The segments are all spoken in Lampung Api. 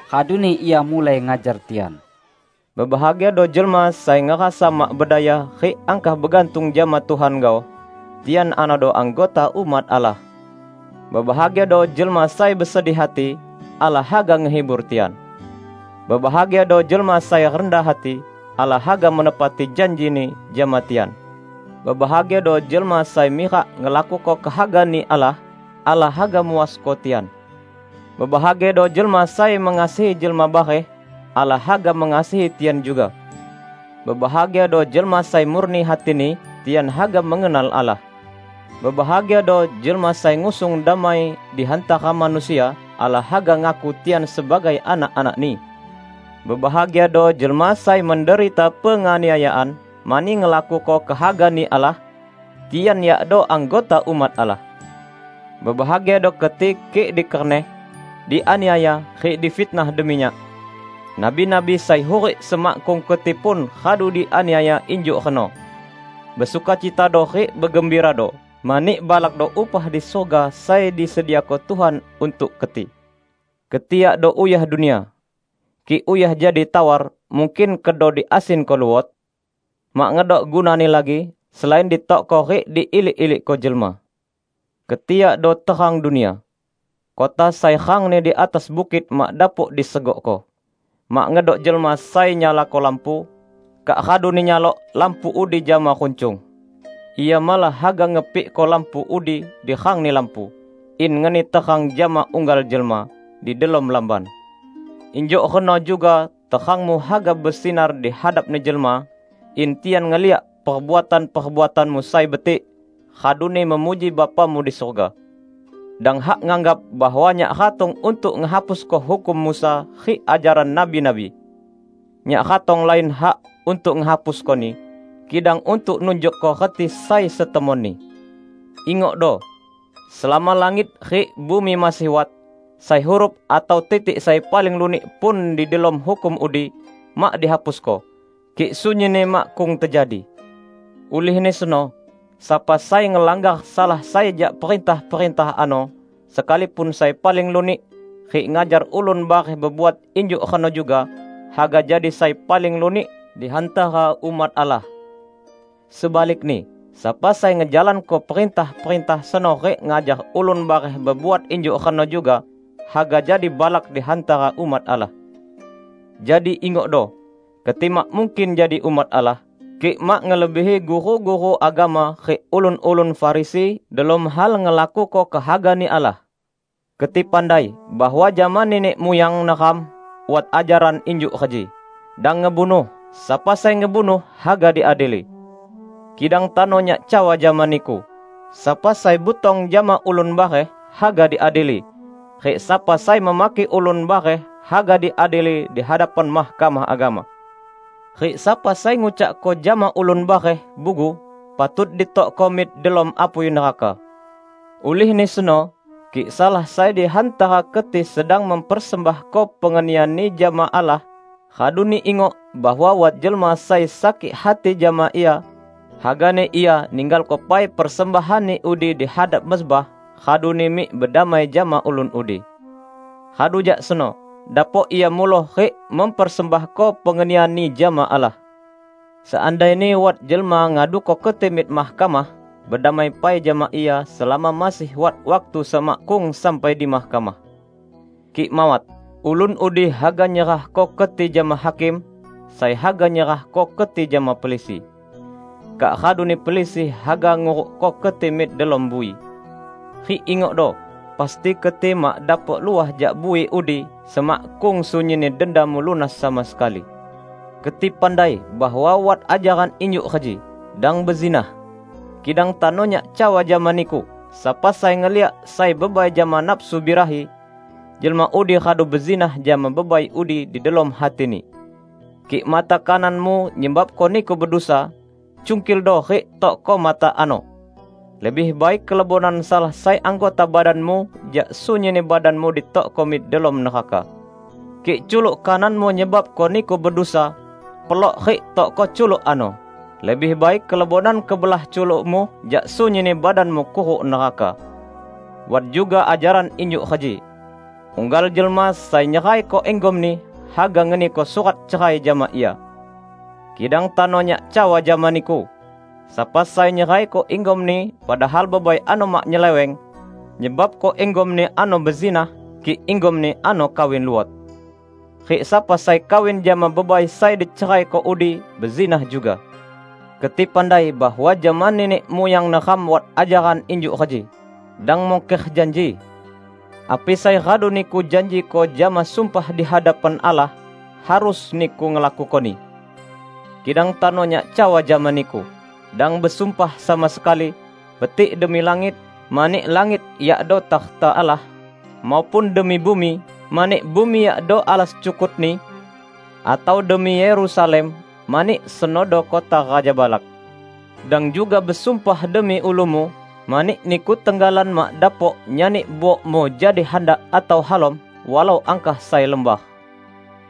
raduni Ia mulai ngajar tian: "Bebahagiado jelma sai ngerasa mak bedaya rik angkah begantung jama Tuhan gaoh; tian anodo anggota umat Allah! Bebahagiado jelma sai besedih hati; Allah haga ngehibur tian! Bebahagiado jelma sai rendah hati; Allah haga menepati janji-Ni jama tian! Bebahagiado jelma sai mirak ngelakuko kehaga-Ni Allah; Allah haga muasko tian! Bebahagiado jelma sai mengasihi jelma bareh; Allah haga mengasihi tian juga! Bebahagiado jelma sai murni hatini; tian haga mengenal Allah. Bebahagiado jelma sai ngusung damai di hantara manusia; Allah haga ngaku tian sebagai anak-anak-Ni! Bebahagiado jelma sai menderita penganiayaan mani ngelakuko kehaga-Ni Allah; tian yakdo anggota umat Allah! Bebahagiado keti kik dikerneh, dianiaya, rik difitnah demi Nyak. Nabi-nabi sai hurik semakkung keti pun radu dianiaya injuk reno. Besukacitado rik begembirado, mani balakdo upah di surga sai disediako Tuhan untuk keti." "Keti yakdo uyah dunia. Kik uyah jadi tawar, mungkin kedo diasinko luot? Mak ngedok gunani lagi, selain ditokko rik diilik-ilikko jelma. Keti yakdo terang dunia. Kota sai rangni di atas bukit mak dapok disegokko. Mak ngedok jelma sai nyalako lampu, kak raduni nyalok lampu udi jama runcung. Ia malah haga ngepikko lampu udi di rangni lampu, in ngeni terang jama unggal jelma di delom lamban. Injuk reno juga terangmu haga besinar dihadapni jelma, in tian ngeliak perbuatan-perbuatanmu sai betik, raduni memuji Bapamu di surga." "Dang hak nganggap bahwa Nyak ratong untuk ngehapusko hukum Musa rik ajaran nabi-nabi. Nyak ratong lain hak untuk ngehapuskoni, kidang untuk nunjukko reti sai setemonni. Ingokdo! Selama langit rik bumi masih wat, sai huruf atau titik sai paling lunik pun di delom hukum udi, mak dihapusko, kik sunyinni makkung tejadi! Ulihni seno, sapa sai ngelanggar salah sai jak perintah-perintah ano, sekalipun sai paling lunik, rik ngajar ulun bareh bebuat injuk reno juga, haga jadi sai paling lunik di hantara umat Allah. Sebalikni, sapa sai ngejalanko perintah-perintah seno rik ngajar ulun bareh bebuat injuk reno juga, haga jadi balak di hantara umat Allah. Jadi, ingokdo: Keti mak mungkin jadi umat Allah, kik mak ngelebihi guru-guru agama rik ulun-ulun Farisi delom hal ngelakuko kehaga-Ni Allah!" "Keti pandai bahwa jama nenek muyang neram wat ajaran injuk reji: Dang ngebunuh; sapa sai ngebunuh, haga diadili. Kidang tano Nyak cawa jama niku, sapa sai butong jama ulun bareh, haga diadili; rik sapa sai memaki ulun bareh, haga diadili di hadapan Mahkamah Agama. Rik sapa sai ngucakko jama ulun bareh, 'Bugu,' patut ditokko mik delom apui neraka. Ulihni seno, kik salah sai di hantara keti sedang mempersembahko pengenianni jama Allah, raduni ingok bahwa wat jelma sai sakik hati jama ia, hagani ia ninggalko pai persembahanni udi di hadap mezbah, raduni mik bedamai jama ulun udi. Radu jak seno, dapok ia muloh rik mempersembahko pengenianni jama Allah. Seandaini wat jelma ngaduko keti mik mahkamah, bedamai pai jama ia selama masih wat waktu semakkung sampai di mahkamah. Kik mawat, ulun udi haga nyerahko keti jama hakim, sai haga nyerahko keti jama pelisi. Kak raduni pelisi haga ngurukko keti mik delom bui. Rik ingokdo: Pasti keti mak dapok luah jak bui udi, semakkung sunyinni dendamu lunas sama sekali." "Keti pandai bahwa wat ajaran injuk reji: Dang bezinah. Kidang tano Nyak cawa jama niku: sapa sai ngeliak sai bebai jama nafsu birahi, jelma udi radu bezinah jama bebai udi di delom hatini. Kik mata kananmu nyebabko niku bedusa, cungkildo rik tokko mata ano! Lebih baik kelebonan salah sai anggota badanmu jak sunyinni badanmu ditokko mik delom neraka. Kik culuk kananmu nyebabko niku bedusa, pelok rik tokko culuk ano! Lebih baik kelebonan kebelah culukmu jak sunyinni badanmu kuruk neraka." "Wat juga ajaran injuk reji: unggal jelma sai nyeraiko inggomni, haga ngeniko surat cerai jama ia. Kidang tano Nyak cawa jama niku: sapa sai nyeraiko inggomni padahal bebai ano mak nyeleweng, nyebabko inggomni ano bezinah, kik inggomni ano kawin luot. Rik sapa sai kawin jama bebai sai diceraiko udi, bezinah juga." "Keti pandai bahwa jama nenek muyang neram wat ajaran injuk reji: dang mungker janji. Api sai radu niku janjiko jama sumpah di hadapan Allah, harus niku ngelakukoni. Kidang tano Nyak cawa jama niku: dang besumpah sama sekali, betik demi langit, mani langit yakdo takhta Allah, maupun demi bumi, mani bumi yakdo alas cukut-Ni; atau demi Yerusalem, mani senodo kota Raja balak. Dang juga besumpah demi ulumu, mani niku tenggalan mak dapok nyani buokmu jadi handak atau halom, walau angkah sai lembar.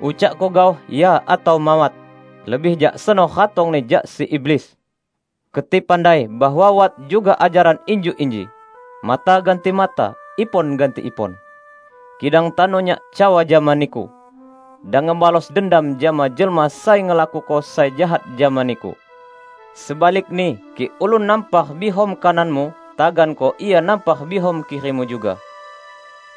Ucakko gaoh 'Ya' atau 'Mawat' -- lebih jak seno ratongni jak si iblis." "Keti pandai bahwa wat juga ajaran injuk inji: mata ganti mata, ipon ganti ipon. Kidang tano Nyak cawa jama niku: dang ngebalos dendam jama jelma sai ngelakuko sai jahat jama niku. Sebalikni kik ulun nampar biham kananmu, taganko ia nampar biham kirimu juga.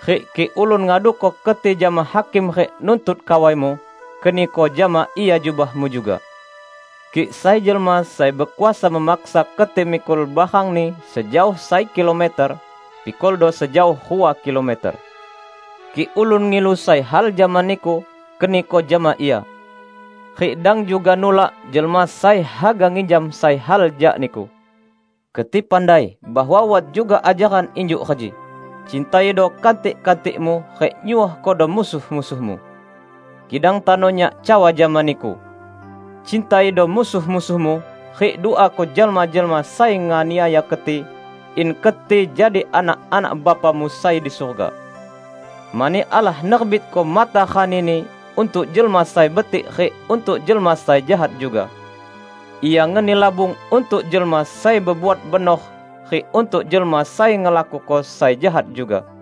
Rik kik ulun ngaduko keti jama hakim rik nuntut kawaimu, keniko jama ia jubahmu juga. Kik sai jelma sai bekuasa memaksa keti mikul barangni sejaoh sai kilometer, pikuldo sejaoh rua kilometer. Kik ulun ngilu sai hal jama niku, keniko jama ia. Rik dang juga nulak jelma sai haga nginjam sai hal jak niku." "Keti pandai bahwa wat juga ajaran injuk reji: cintaido kantik-kantikmu rik nyuohkodo musuh-musuhmu. Kidang tano Nyak cawa jama niku: cintaido musuh-musuhmu, rik duako jelma-jelma sai nganiaya keti, in keti jadi anak-anak Bapamu sai di surga. Mani Allah nerbitko matarani-Ni untuk jelma sai betik rik untuk jelma sai jahat juga. Ia ngeni labung untuk jelma sai bebuat benor rik untuk jelma sai ngelakuko sai jahat juga.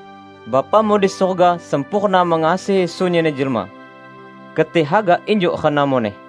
Bapamu di surga sempurna mengasihi sunyinni jelma. Keti haga injuk reno muneh."